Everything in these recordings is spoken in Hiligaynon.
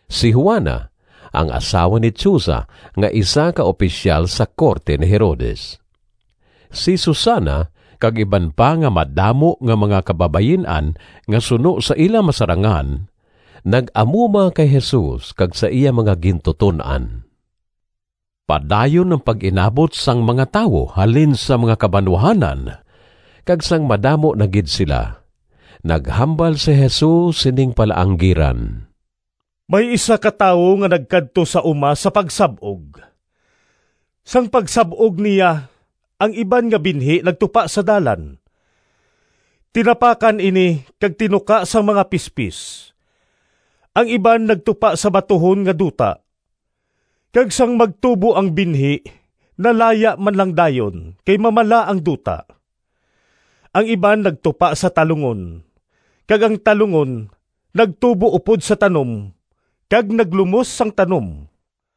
si Juana, ang asawa ni Chuza nga isa ka opisyal sa korte ni Herodes; si Susana, kag iban pa nga madamo nga mga kababayin-an nga suno sa ila masarangan nag-amuma kay Jesus kag sa iya mga gintuton-an. Padayon ang pag-inabot sang mga tawo halin sa mga kabanwahanan, kag sang madamo na gid sila, naghambal si Jesus sining palaanggiran. “May isa ka tawo nga nagkadto sa uma sa pagsab-og. Sang pagsab-og niya ang iban nga binhi nagtupa sa dalan. Tinapakan ini kag tinuka sang mga pispis. Ang iban nagtupa sa batuhon nga duta, kag sang magtubo ang binhi nalaya man lang dayon kay mamala ang duta. Ang iban nagtupa sa talungon kag ang talungon nagtubo upod sa tanom kag naglumos sang tanom.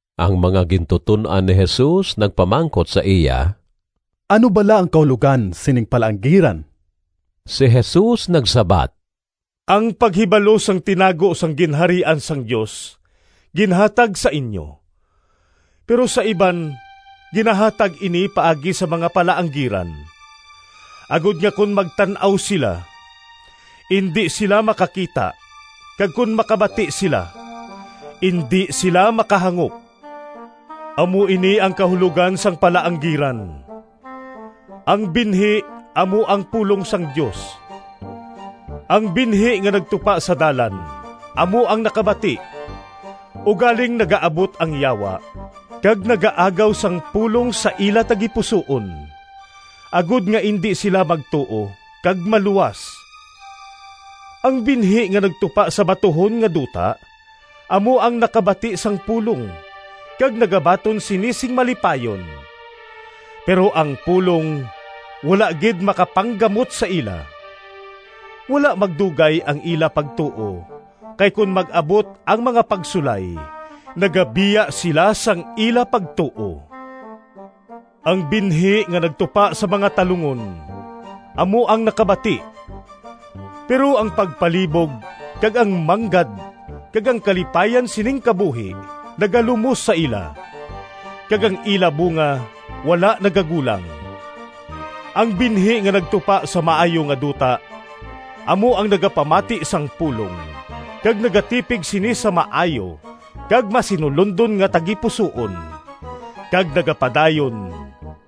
Ang mga gintuton-an ni Jesus nagpamangkot sa iya, “Ano bala ang kahulogan sining palaanggiran?” Si Jesus nagsabat, “Ang paghibalo sang tinago sang Ginharian sang Dios ginhatag sa inyo. Pero sa iban ginahatag ini paagi sa mga palaanggiran, agod nga kon magtan-aw sila, indi sila makakita kag kon makabati sila, indi sila makahangop.” “Amo ini ang kahulogan sang palaanggiran: ang binhi amo ang pulong sang Dios. Ang binhi nga nagtupa sa dalan amo ang nakabati, ugaling nagaabot ang Yawa kag nagaagaw sang pulong sa ila tagipusoon, agod nga indi sila magtuo kag maluwas. Ang binhi nga nagtupa sa batuhon nga duta amo ang nakabati sang pulong kag nagabaton sini sing malipayon. Pero ang pulong wala gid makapanggamot sa ila. Wala magdugay ang ila pagtuo kay kon mag-abot ang mga pagsulay, nagabiya sila sang ila pagtuo. Ang binhi nga nagtupa sa mga talungon amo ang nakabati, pero ang pagpalibog kag ang manggad kag ang kalipayan sining kabuhi nagalumos sa ila, kag ang ila bunga wala nagagulang. Ang binhi nga nagtupa sa maayo nga duta amo ang nagapamati sang pulong kag nagatipig sini sa maayo kag masinulondon nga tagipusoon kag nagapadayon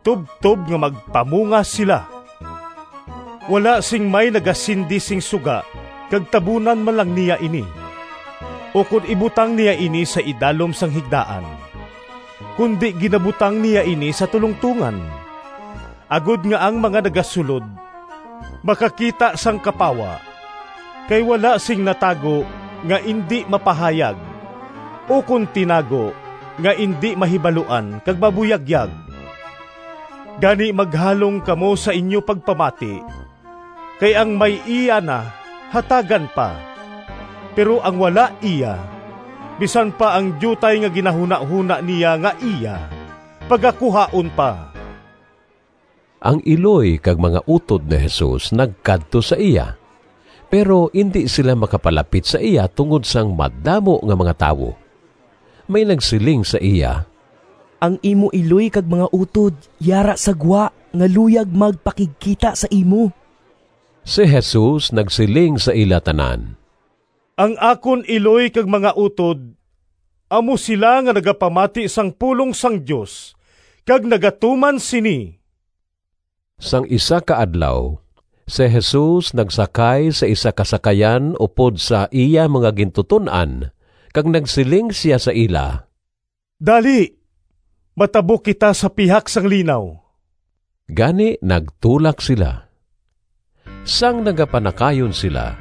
tubtob nga magpamunga sila.” “Wala sing may nagasindi sing suga kag tabunan man lang niya ini, ukon ibutang niya ini sa idalom sang higdaan, kundi ginabutang niya ini sa tulongtongan, agod nga ang mga nagasulod makakita sang kapawa. Kay wala sing natago nga indi mapahayag, ukon tinago nga indi mahibaluan kag mabuyagyag. “Gani maghalong kamo sa inyo pagpamati. Kay ang may iya na hatagan pa, pero ang wala iya, bisan pa ang diutay nga ginahunahona niya nga iya pagakuhaon pa.” Ang iloy kag mga utod ni Jesus nagkadto sa iya, pero indi sila makapalapit sa iya tungod sang madamo nga mga tawo. May nagsiling sa iya, “Ang imo iloy kag mga utod yara sa gwa nga luyag magpakigkita sa imo.” Si Jesus nagsiling sa ila tanan, “Ang akon iloy kag mga utod amo sila nga nagapamati sang pulong sang Dios kag nagatuman sini.” Sang isa ka adlaw si Jesus nagsakay sa isa ka sakayan upod sa iya mga gintuton-an kag nagsiling sia sa ila: “Dali, matabok kita sa pihak sang linaw.” Gani nagtulak sila. Sang nagapanakayon sila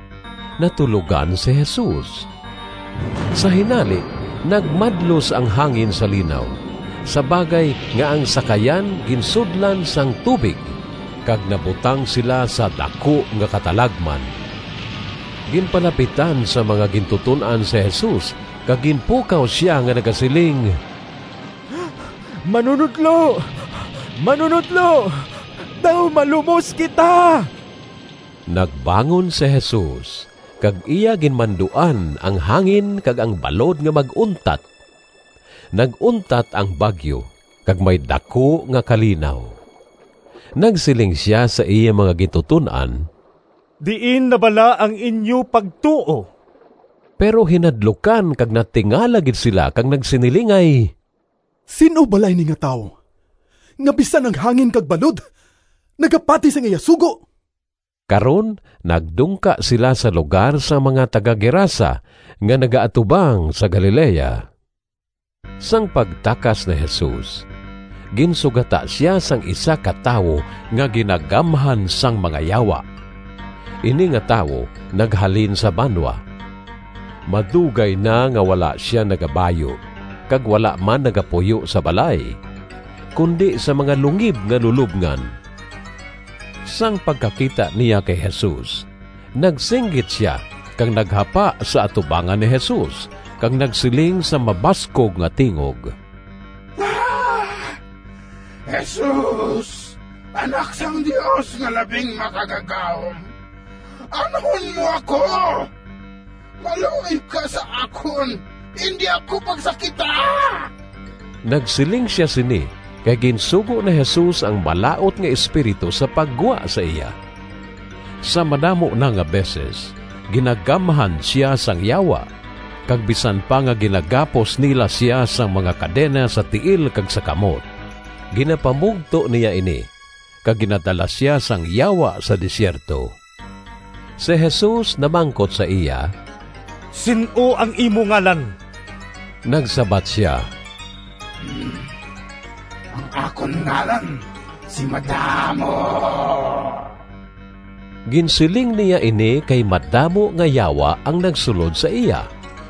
natulogan si Jesus. Sa hinali nagmadlos ang hangin sa linaw, sa bagay nga ang sakayan ginsudlan sang tubig kag nabutang sila sa daku nga katalagman. Ginpalapitan sang mga gintuton-an si Jesus kag ginpukaw sia nga nagasiling, “Manunodlo, Manunodlo! Daw malumos kita!” Nagbangon si Jesus kag iya ginmanduan ang hangin kag ang balod nga mag-untat. Nag-untat ang bagyo kag may daku nga kalinaw. Nagsiling sia sa iya mga gintuton-an, “Diin na bala ang inyo pagtuo?” Pero hinadlukan kag natingala gid sila kag nagsinilingay, “Sin-o bala ini nga tawo, nga bisan ang hangin kag balod nagapati sang iya sugo?” Karon nagdungka sila sa lugar sang mga taga-Gerasa nga nagaatubang sa Galilea. Sang pagtakas ni Jesus, ginsugata sia sang isa ka tawo nga ginagamhan sang mga yawa. Ini nga tawo naghalin sa banwa. Madugay na nga wala sia nagabayu kag wala man nagapuyo sa balay, kundi sa mga lungib nga lulobngan. Sang pagkakita niya kay Jesus nagsinggit sia kag naghapa sa atubangan ni Jesus kag nagsiling sa mabaskog nga tingog, “Jesus, Anak sang Dios nga Labing Makagagahom, anhon mo ako? Maluoy ka sa akon, indi ako pagsakita!” Nagsiling sia sini kay ginsugo ni Jesus ang malaut nga espiritu sa paggwa sa iya. Sa madamo na nga beses ginagamhan sia sang yawa, kag bisan pa nga ginagapos nila sia sang mga kadena sa tiil kag sa kamot, ginapamugto niya ini kag ginadala sia sang yawa sa desierto. Si Jesus namangkot sa iya, “Sin-o ang imo ngalan?” Nagsabat sia, “Ang akon ngalan si ‘Madamo.’” Ginsiling niya ini kay madamo nga yawa ang nagsulod sa iya.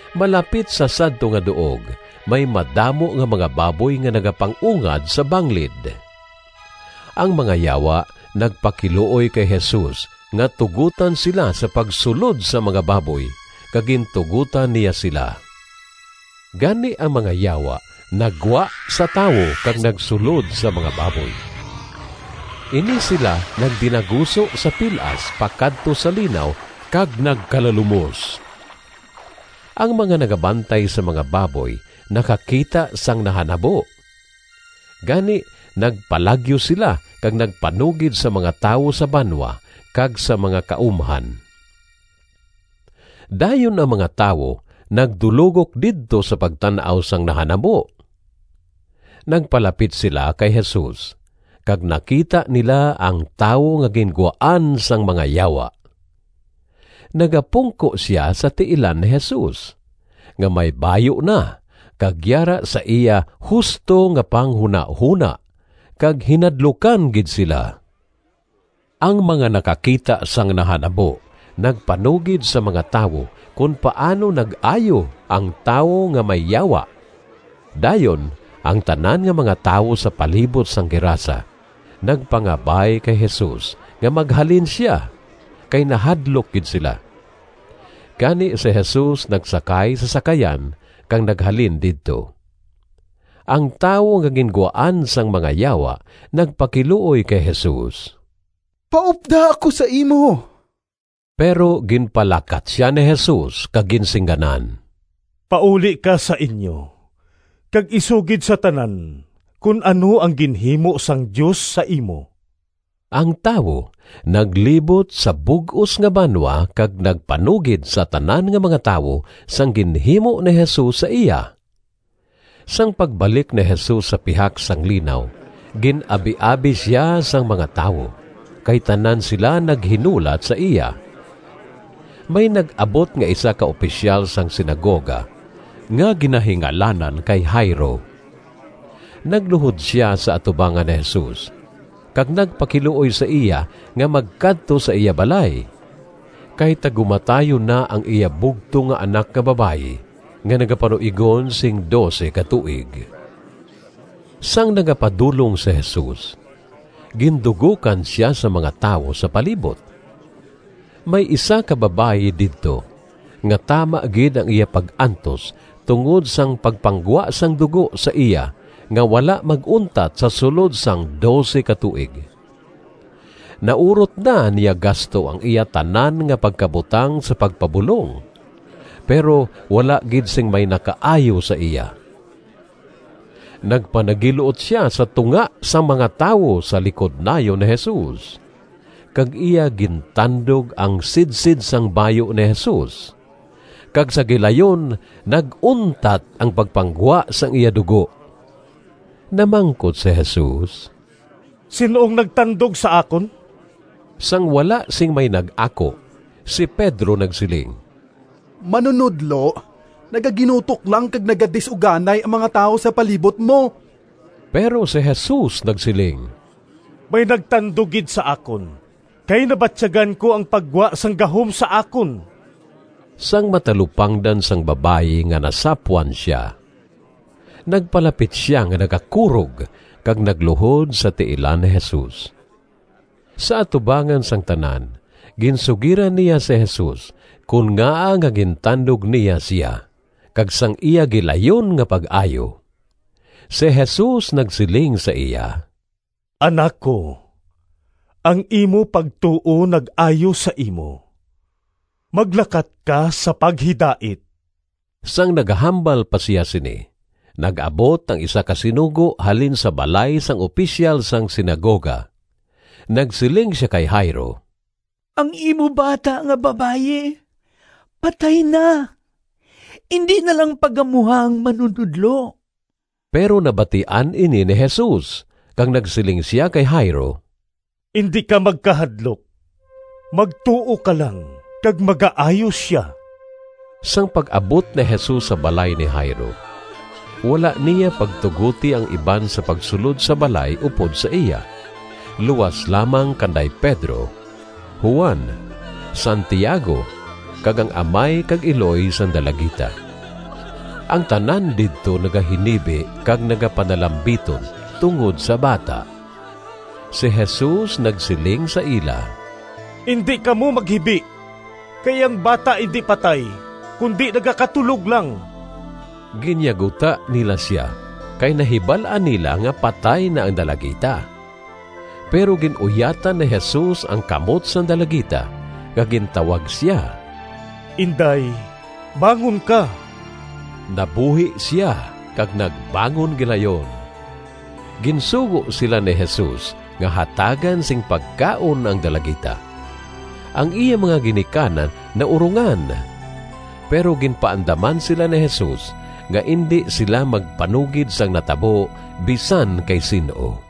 Malapit sa sadto nga duog may madamo nga mga baboy nga nagapang-ungad sa banglid. Ang mga yawa nagpakiluoy kay Jesus nga tugotan sila sa pagsulod sa mga baboy, kag gintugotan niya sila. Gani ang mga yawa naggwa sa tawo kag nagsulod sa mga baboy. Ini sila nagdinaguso sa pil-as pakadto sa linaw kag nagkalalumos. Ang mga nagabantay sang mga baboy nakakita sang nahanabo. Gani, nagpalagyo sila kag nagpanugid sa mga tawo sa banwa kag sa mga kaumhan. Dayon ang mga tawo nagdulogok didto sa pagtan-aw sang nahanabo. Nagpalapit sila kay Jesus kag nakita nila ang tawo nga gingwaan sang mga yawa. Nagapungko sia sa tiilan ni Jesus, nga may bayu na kag yara sa iya husto nga panghunahona, kag hinadlukan gid sila. Ang mga nakakita sang nahanabo nagpanugid sa mga tawo kon paano nag-ayo ang tawo nga may yawa. Dayon ang tanan nga mga tawo sa palibot sang Gerasa nagpangabay kay Jesus nga maghalin sia, kay nahadlok gid sila. Gani si Jesus nagsakay sa sakayan kag naghalin didto. Ang tawo nga gingwaan sang mga yawa nagpakiluoy kay Jesus, “Paupda ako sa imo.” Pero ginpalakat sia ni Jesus kag ginsingganan, “Pauli ka sa inyo kag isugid sa tanan kon ano ang ginhimo sang Dios sa imo.” Ang tawo naglibot sa bug-os nga banwa kag nagpanugid sa tanan nga mga tawo sang ginhimo ni Jesus sa iya. Sang pagbalik ni Jesus sa pihak sang linaw gin-abiabi sia sang mga tawo, kay tanan sila naghinulat sa iya. May nag-abot nga isa ka opisyal sang sinagoga nga ginahingalanan kay Jairo. Nagluhod sia sa atubangan ni Jesus kag nagpakiluoy sa iya nga magkadto sa iya balay, kay tagumatayon na ang iya bugtong nga anak nga babayi nga nagapanuigon sing dose ka tuig. Sang nagapadulong si Jesus, gindugokan sia sang mga tawo sa palibot. May isa ka babayi didto nga tama gid ang iya pag-antos tungod sang pagpanggwa sang dugo sa iya nga wala mag-untat sa sulod sang dose ka tuig. Naurot na niya gasto ang iya tanan nga pagkabutang sa pagpabulong, pero wala gid sing may nakaayo sa iya. Nagpanagil-ot sia sa tunga sang mga tawo sa likod nayon ni Jesus, kag iya gintandog ang sidsid sang bayu ni Jesus kag sa gilayon nag-untat ang pagpanggwa sang iya dugo. Namangkot si Jesus, “Sin-o ang nagtandog sa akon?” Sang wala sing may nag-ako, si Pedro nagsiling, “Manunodlo, nagaginutok lang kag nagadis-uganay ang mga tawo sa palibot mo.” Pero si Jesus nagsiling, “May nagtandog gid sa akon, kay nabatyagan ko ang paggwa sang gahom sa akon.” Sang matalupangdan sang babayi nga nasapwan sia, nagpalapit sia nga nagakurog kag nagluhod sa tiilan ni Jesus. Sa atubangan sang tanan ginsugiran niya si Jesus kon ngaa nga gintandog niya sia kag sang iya gilayon nga pag-ayo. Si Jesus nagsiling sa iya, “Anak ko, ang imo pagtuo nag-ayo sa imo. Maglakat ka sa paghidait.” Sang nagahambal pa sia sini nag-abot ang isa ka sinugo halin sa balay sang opisyal sang sinagoga. Nagsiling sia kay Jairo, “Ang imo bata nga babayi patay na. Indi na lang paggamuha ang Manunodlo.” Pero nabatian ini ni Jesus, kag nagsiling sia kay Jairo, “Indi ka magkahadlok, magtuo ka lang kag magaayo sia.” Sang pag-abot ni Jesus sa balay ni Jairo wala niya pagtugoti ang iban sa pagsulod sa balay upod sa iya luas lamang kanday Pedro, Juan, Santiago kag ang amay kag iloy sang dalagita. Ang tanan didto nagahinibi kag nagapanalambiton tungod sa bata. Si Jesus nagsiling sa ila, “Indi kamo maghibi, kay ang bata indi patay kundi nagakatulog lang.” Ginyaguta nila sia, kay nahibal-an nila nga patay na ang dalagita. Pero gin-uyatan ni Jesus ang kamot sang dalagita kag gintawag sia, “Inday, bangon ka.” Nabuhi sia kag nagbangon gilayon. Ginsugo sila ni Jesus nga hatagan sing pagkaon ang dalagita. Ang iya mga ginikanan naurongan, pero ginpaandaman sila ni Jesus nga indi sila magpanugid sang natabo bisan kay sin-o.